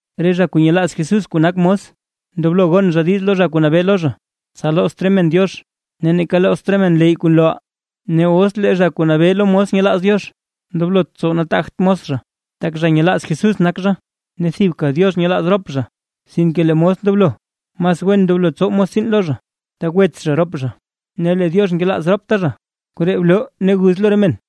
Re zha kuu nyelaaz Jesús kuu nak mos, ndoblo gon zha diiz lo zha kuu nabee lo zha, tsa loozt re men Diox, ne neeka loozt re men leyy kuu nlooʼaa. Ne os lee zha kuu nabee lo mos nyelaaz Diox, ndoblot tsow nataagt mos zha, tak zha nyelaaz Jesús nak zha ne tak thibka Diox nyelaaz rop zha. Sinke lee mos ndoblo mas wen ndoblo tsow mos tsiin lo zha, tak wets zha rop zha ne lee Diox nkelaaz ropta zha. Koree bloo ne guz lo re men.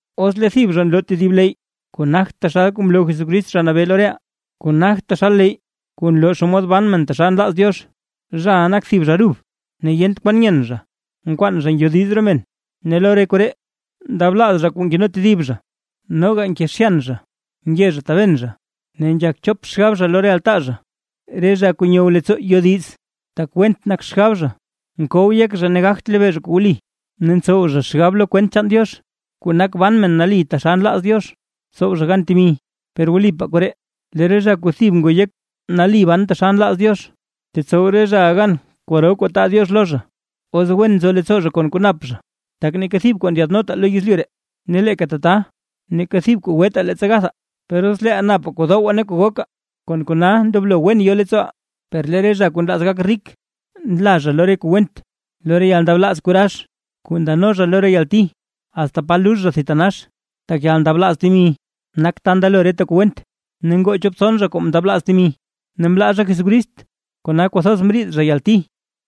Os lee thib zha nloo tedib leyy kuu nagt taxal kuu mloo Jesucrist Zha Nabee lo reʼaa, kuu nagt taxal leyy kuu nloo naa xomod ban men taxal nlaaz Diox. Zhaʼa nak thib zha rub, ne yent kwan nyen zha, nkwaan zha ngyodiz re men. Ne lo re koree ndroo ndablaaz zha kuu nkeno tedib zha, noga nkezhyan zha, nge zha taben zha, ne nzhak chop xgab zha lo re altaa zha, re zha kuu nyow leettsoo yodiz, tak went nak xgab zha, mkow yek zha ne gagt lebee zha kuu wli. Ne ntsow zha xgab lo kwent chaan Diox, kuu nak ban men nali taxal nlaaz Diox, tsow zha gan temi. Per wlipaa koree, lee re zha kuu thib ngoo yek nali ban taxal nlaaz Diox, tetsow re zhaʼa gan kwaro kuu taa Diox lo zha, os wen nzo leettsoo zha kon kuu nap zha. Tak neeka thib kuu ndyaadnotaa lo yezlyu ree, ne leeka tata neeka thib kuu gwetaa leettsa gathaa. Per os leeʼaa napaa kuu dowaa ne kuu gokaa; kon kona ndoblo wen yo leettsooʼaa. Per lee re zha kuu nlaaz gak rik, nla zha lo re kuu went; lo re yalndablaaz kuu rax, kuu ndano zha lo re yalti asta pa lux zha thitanax. Tak yalndablaaz temi nak ta ndelo reta kuu went. Ne ngoo chop tson zha kuu mndablaaz temi, ne mlaa zha Jesucrist kona kwathoz mriid zha yalti.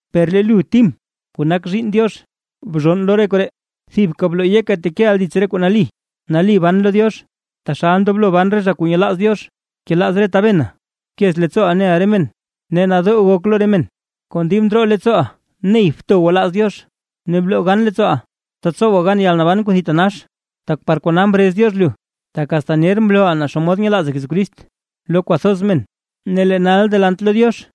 Per lee lu Tim, kuu nak zhiinn Diox. Bzhonn lo re koree, thibka bloo yeka tekeʼa dits re kuu nali, nali ban lo Diox, taxal ndoblo ban re zha kuu nyelaaz Diox, bkelaaz re tabena, bkez leettsooʼa neʼa re men, ne nadoo gok lo re men. Kon dib ndroo leettsooʼa ney bto gwalaaz Diox, ne bloo gan leettsooʼa, tsa tsowa gan yalnaban kuu thitanax, tak par kona mrez Diox lu, tak asta ner mlooʼa naa xomod nyelaaza Jesucrist lo kwathoz men. Ne lee nal delant lo Diox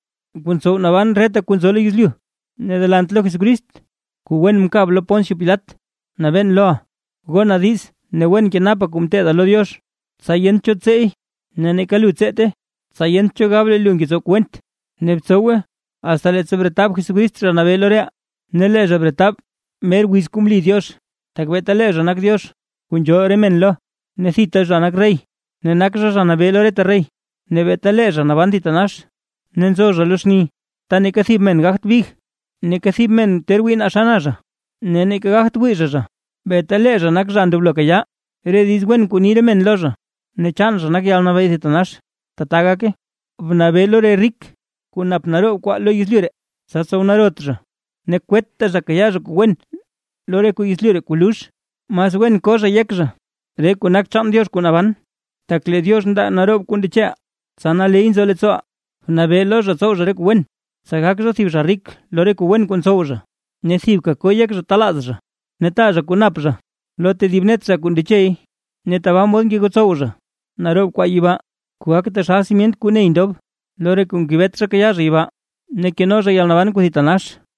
kuu ntsow mban reta kuu nzo lo yezlyu, ne delant lo Jesucrist kuu wen mkab lo Poncio Pilat nabeen loʼa, gona diiz ne wen kenapa kuu mteeda lo Diox, tsa yent cho tseey, ne neeka lu tseete, tsa yent cho gab lee lu ngetsow kuu went. Ne btsowe asta leettsa bretab Jesucrist Zha Nabee lo reʼaa. Ne lee zha bretab mer wiz kuu mli Diox. Tak beeta lee zha nak Diox kuu nzhool re men lo, ne thita zha nak rey, ne nak Zha Nabee lo reta rey, ne beeta lee zha naban thitanax, ne nzo zha lo xni ta neeka thib men gagt big. Neeka thib men ter wii naa xa na zha, ne neeka gagt wii zha zha. ¡Beeta lee zha nak zha ndoblo kayaa re diiz wen kuu ni re men lo zha, ne chaan zha nak yalnabee thitanax! ¡Tata gake! Bnabee lo re rik, kuu nap naroob kwaa lo yezlyu ree, tsa tsow narot zha, ne kwetta zha kayaa zha kuu wen lo re kuu yezlyu ree kuu lux. Mas wen ko zha yek zha re kuu nak chaan Diox kuu naban, tak lee Diox ndaa naroob kuu ndecheʼaa, tsa naley nzo leettsooʼaa. Bnabee lo zha tsow zha re kuu wen, tsa gak zha thib zha rik lo re kuu wen kuu ntsow zha, ne thibka ko yek zha talaaz zha ne taa zha kuu nap zha lo tedib net zha kuu ndechey. Ne tabaa mod ngegotsow zha naroob kwaa yibaa, kuu gak taxal simyent kuu ney ndob lo re kuu ngebet zha kayaa zha yibaa, ne keno zha yalnaban kuu thitanax.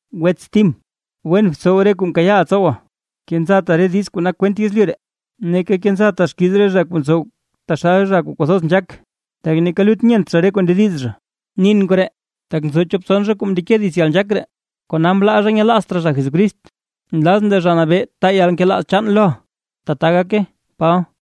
Wets Tim, wen btsow re kuu mkayaaʼa tsowa. Kenzata re diiz kuu nak kwent yezlyu ree, ne neeka kenzata xkiiz re zha kuu ntsow taxal zha kuu kwathoz nzhaak, tak neeka lut nyent zha re kuu ndediz zha. Nin koree, tak nzo chop tson zha kuu mndeke dits yalnzhaak ree, kona mlaa zha nyelaazt raa zha Jesucrist. Nlazʼn lee Zha Nabee taa yalnkelaaz chaan loʼa. ¡Tbaa gake! Paba